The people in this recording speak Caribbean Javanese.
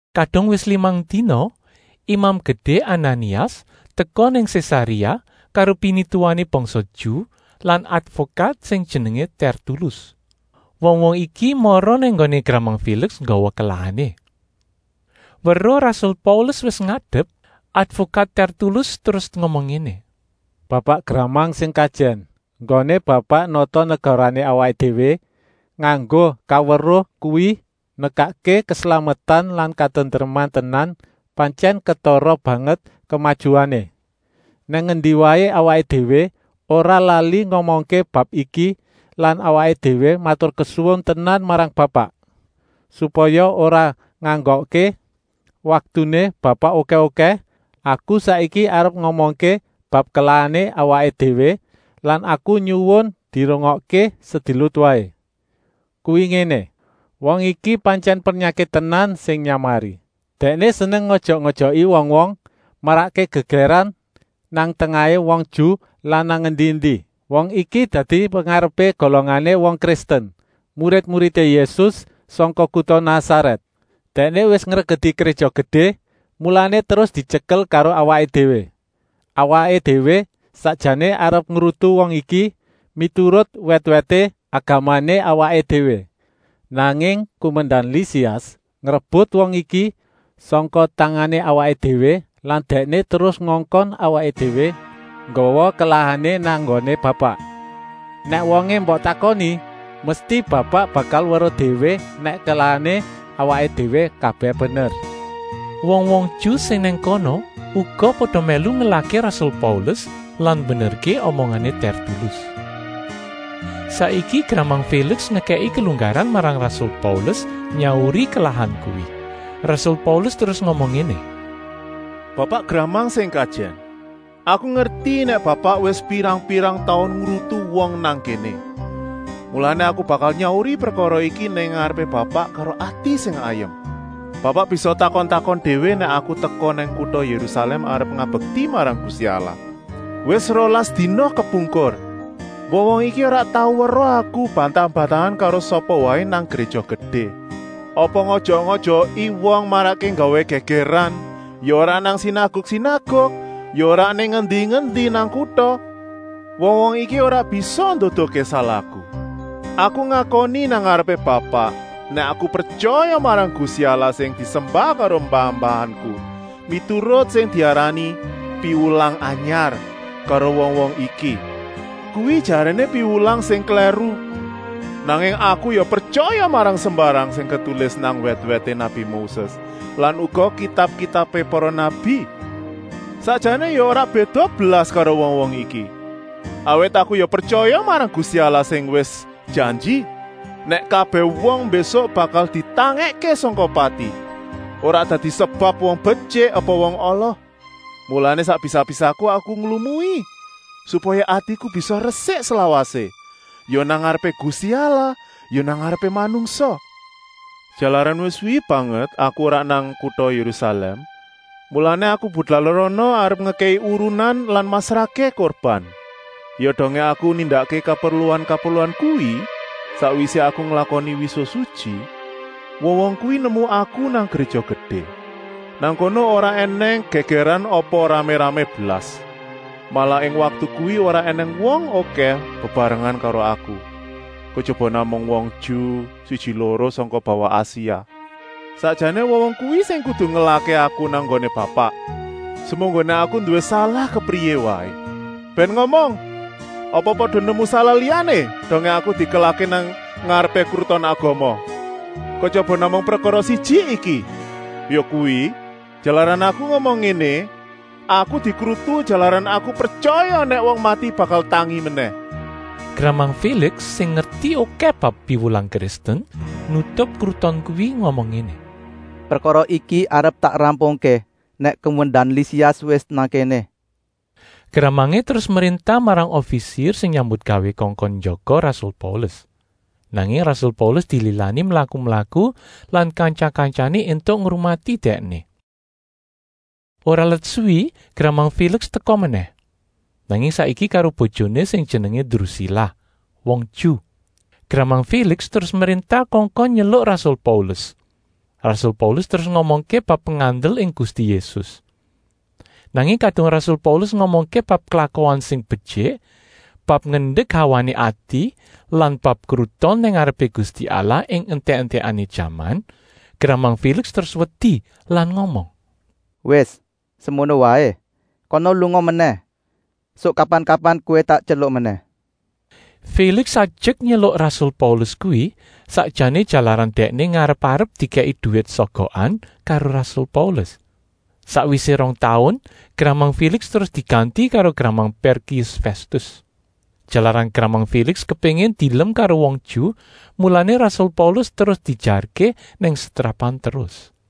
Kadung wis limang dina, Imam Gedé Ananias teka nang Sésaréa karo pinituwané bangsa Ju lan advokat sing jenengé Tèrtulus. Wong-wong iki mara nang nggoné gramang Féliks nggawa kelahané. Weruh rasul Paulus wis ngadep, advokat Tèrtulus terus ngomong ngéné: “Bapak gramang sing kajèn, enggoné Bapak nata negarané awaké déwé nganggo kaweruh kuwi nekakké keslametan lan katentreman tenan. Pantyèn ketara banget kemajuané. Nang endi waé awaké déwé ora lali ngomongké bab iki lan awaké déwé maturkesuwun tenan marang Bapak. Supaya ora nganggokké waktuné Bapak okèh-okèh, aku saiki arep ngomongké bab kelahané awaké déwé lan aku nyuwun dirungokké sedilut waé. Kuwi ngéné: wong iki pantyèn pernyakit tenan sing nyamari. Dèkné seneng ngojok-ojoki wong-wong, marakké gègèran nang tengahé wong Ju lan nang endi-endi. Wong iki dadi pengarepé golongané wong Kristen, murid-muridé Yésus sangka kuta Nasarèt. Dèkné wis ngregeti Gréja Gedé, mulané terus dityekel karo awaké déwé. Awaké déwé sakjané arep ngrutu wong iki miturut wèt-wèté agamané awaké déwé, nanging kumendan Lisias ngrebut wong iki sangka tangané awaké déwé lan dèkné terus ngongkon awaké déwé nggawa kelahané nang nggoné Bapak. Nèk wongé mbok takoni, mesti Bapak bakal weruh déwé nèk kelahané awaké déwé kabèh bener.” Wong-wong Ju sing nang kono uga pada mèlu ngelahké rasul Paulus lan mbenerké omongané Tèrtulus. Saiki gramang Féliks ngekèki kelunggaran marang rasul Paulus nyauri kelahan kuwi. Rasul Paulus terus ngomong ngéné: “Bapak gramang sing kajèn, aku ngerti nèk Bapak wis pirang-pirang taun ngrutu wong nang kéné, mulané aku bakal nyauri prekara iki nang ngarepé Bapak karo ati sing ayem. Bapak bisa takon-takon déwé nèk aku teka nang kuta Yérusalèm arep ngabekti marang Gusti Allah, wis rolas dina kepungkur. Wong-wong iki ora tau weruh aku bantah-bantahan karo sapa waé nang Gréja Gedé, apa ngojok-ojoki wong marakké nggawé gègèran. Ya ora nang sinaguk-sinaguk, ya ora nang endi-endi nang kuta. Wong-wong iki ora bisa nduduhké salahku. Aku ngakoni nang ngarepé Bapak, nèk aku pretyaya marang Gusti Allah sing disembah karo mbah-mbahanku, miturut sing diarani ‘Piwulang Anyar’ karo wong-wong iki. Kuwi jaréné piwulang sing klèru. Nanging aku ya pretyaya marang sembarang sing ketulis nang wèt-wèté nabi Moses lan uga kitab-kitabé para nabi. Sakjané ya ora béda blas karo wong-wong iki, awit aku ya pretyaya marang Gusti Allah sing wis janji, nèk kabèh wong mbésuk bakal ditangèkké sangka pati, ora dadi sebab wong betyik apa wong ala. Mulané sak bisa-bisaku aku nglumui supaya atiku bisa resik slawasé, ya nang ngarepé Gusti Allah, ya nang ngarepé manungsa. “Jalaran wis suwi banget aku ora nang kuta Yérusalèm, mulané aku teka rana arep ngekèki urunan lan masrahké kurban. Ya dongé aku nindakké kaperluan-kaperluan kuwi, sakwisé aku nglakoni wisuh sutyi, wong-wong kuwi nemu aku nang Gréja Gedé. Nang kono ora ènèng gègèran apa ramé-ramé blas, malah ing waktu kuwi ora ènèng wong okèh bebarengan karo aku, kejaba namung wong Ju siji-loro sangka bawah Asia. Sakjané wong-wong kuwi sing kudu ngelahké aku nang nggoné Bapak, semunggoné aku nduwé salah kepriyé waé. Bèn ngomong apa pada nemu salah liyané dongé aku dikelahké nang ngarepé Kruton Agama, kejaba namung prekara siji iki, yakuwi, jalaran aku ngomong ngéné: ‘Aku dikrutu jalaran aku pretyaya nèk wong mati bakal tangi menèh.’” Gramang Féliks sing ngerti okèh bab piwulang Kristen, nutup kruton kuwi ngomong ngéné: “Prekara iki arep tak rampungké nèk kumendan Lisias wis nang kéné.” Gramangé terus mréntah marang ofisir sing nyambutgawé kongkon njaga rasul Paulus, nanging rasul Paulus dililani mlaku-mlaku lan kantya-kantyané éntuk ngrumati dèkné. Ora let suwi gramang Féliks teka menèh, nanging saiki karo bojoné sing jenengé Drusila, wong Ju. Gramang Féliks terus mréntah kongkon nyeluk rasul Paulus. Rasul Paulus terus ngomongké bab pengandel ing Gusti Yésus. Nanging kadung rasul Paulus ngomongké bab klakuan sing betyik, bab ngendek hawané ati lan bab kruton nang ngarepé Gusti Allah ing entèk-entèkané jaman, gramang Féliks terus wedi lan ngomong: “Wis, semono waé, kana lunga menèh. Suk kapan-kapan kowé tak tyeluk menèh.” Féliks ajek nyeluk rasul Paulus kuwi sakjané jalaran dèkné ngarep-arep dikèki duwit sogokan karo rasul Paulus. Sakwisé rong taun gramang Féliks terus diganti karo gramang Pèrkius Fèstus. Jalaran gramang Féliks kepéngin dielem karo wong Ju, mulané rasul Paulus terus diejarké nang setrapan terus.